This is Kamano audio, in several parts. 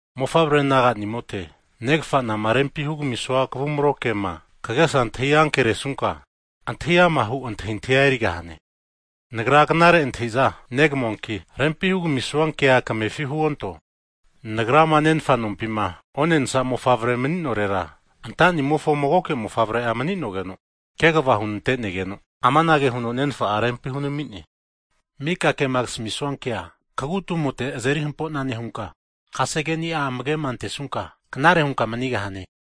Mofavre naga'nimota, negafanama rempi hugamisua kavumro kema kagesa antahi ankeresunka, antahi ama' hu antahintahia erigahane. Nagra knare antahiza negamuanki, rempi hugamisua kea kamefira huonto. Nagrama nenfa nompima onensa mofavrema mani'norera, anta'nimofo magoke mofavre'a mani'nogeno kegava hunante'negeno, amanage huno nenfa'a rempi hunami'ne, Mika kema kasamisua kea kagu tumote erintenka azeri hampo'na nehunka, kasegeni'a amage'ma antesunka, knare hunka manigahane.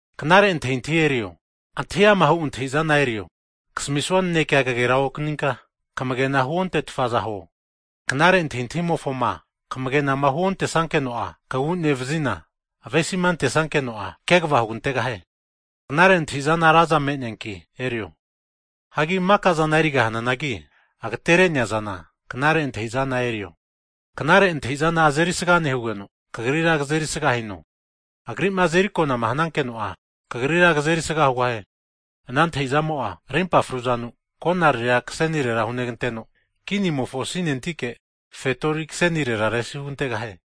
Knare antahintahia erio, antahi amahu antahi'zana erio, kasamisua nanekea kagera okaninka, kamagena huontetfa'za huo. Knare antahintahimofoma kamagenama huontesankeno'a, kagu nevazina avesima antesankeno'a, kegava hugantegahie. Knare antahintahi'zana raza me'neanki erio. Hagi maka'zana erigahananagi agatere'nea zana knare antahi'za erio. Knare antahintahi zana azerisga nehugeno, kagrira kazeri sga hino, agri'ma azeri akonama hanankeno'a, kagrira ran kagi kamigahie. Ana antahi'zamo'a, rimpa fru'zanu konariria kasenire huneganteno, kinimofo asinentike fetori kasenire resi hugantegahie.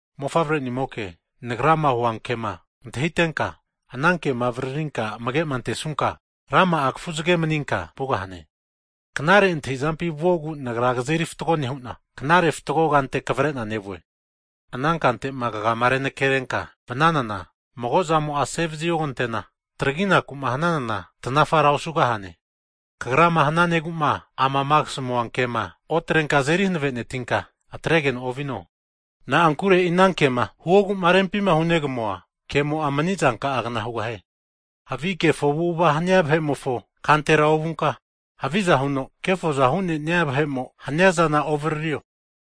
Mofavrenimoke, nagrama huankema antahitenka, ana kema avaririnka amage'ma antesunka, rama'a kafuzage maninka vugahane. Knare antahizampi vuogu nagra kazeri fatgo nehu'na, knare fatgo kante kavare'na nevue. Ana kantema kagama renakerenka vananana mago zamo'a asevazi ogantena, traginaku'ma hananana tanafara osugahane. Kagrama hananegu'ma amama kasamua kea otrenka azeri hanavenetinka atregeno ovino. Na'ankure e'i ana kema huogu'ma rempima hunegamua kemo'a mani'zanka'agna hugahie. Havi kefo avu'ava hania vahe'mofo kantera ovunka, haviza huno kefoza hu'ne'nia vahe'mo hania zana ovaririo.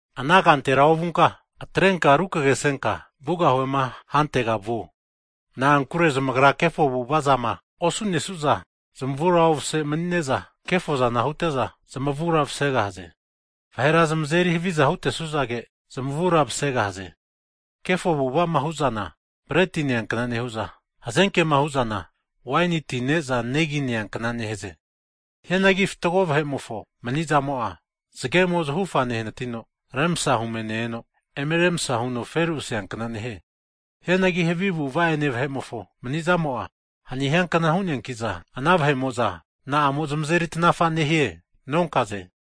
Ana kantera ovunka, atrenka rukagesenka vugahuema hantega vuo. Na'ankure zamagra kefo avu'ava zama osu'nesu'za zamavura ovase'za mani'ne'za kefozana hute'za zamavura masegahaze. Vahera zamazeri haviza hutesuzage, zamavura vasegahaze. Kefo avu'ava'ma hu'zana, breti neankna nehu'za, hazenkema hu'zana waini ti ne'za negi neankna nehaze. Hianagi fatgo vahe'mofo mani'zamo'a, zagemo zahufa nehanatino remsa hume ne-eno, eme remsa huno feru aseankna nehie. Hianagi havi avu'ava ene vahe'mofo mani'zamo'a, hani hiankna hu'neanki'za, ana vahe'mo'za na'amo zamazeri tanafa nehie nonkaze.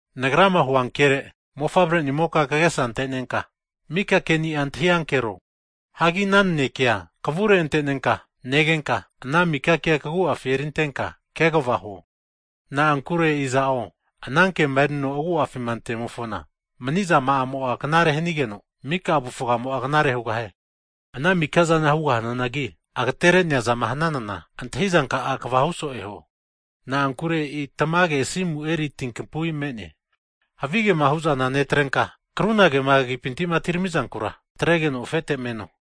Nagrama huankere mofavrenimoka kagesa antenenka, mika keni'a antahi ankero. Hagi ana nanekea kavure antenenka negenka, ana mika kea kagu'afi erintenka kegava huo. Na'ankure iza'o ana kema erino agu'afima antemofona, mani'zama'amo'a knare hanigeno, mika avufgamo'a knare hugahie. Ana mika'zana hugahananagi agatere'nea zama hananana, antahi zanka'a kegavahu so'e huo. Na'ankure e'i tamage asimu erisana tinkampui me'ne. Havigema hu'zana netrenka, krunagema kagipinti'ma atiramizankura atregeno afete meno.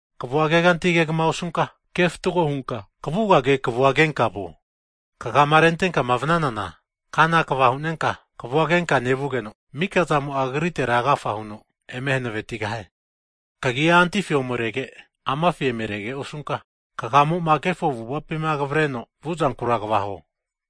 Kavua kegantigama osunka, ke fatgo hunka kavugage kavua kenka vuo. Kagama rentenkama vanana kana kva hu'nenka, kavua kenka nevugeno, mika zamo'a kagritera agafa huno eme hanavetigahie. Kagia antifi omerege amafi emerege osunka, kagamo'ma kefo avu'avapima kavareno vuzankura kva huo.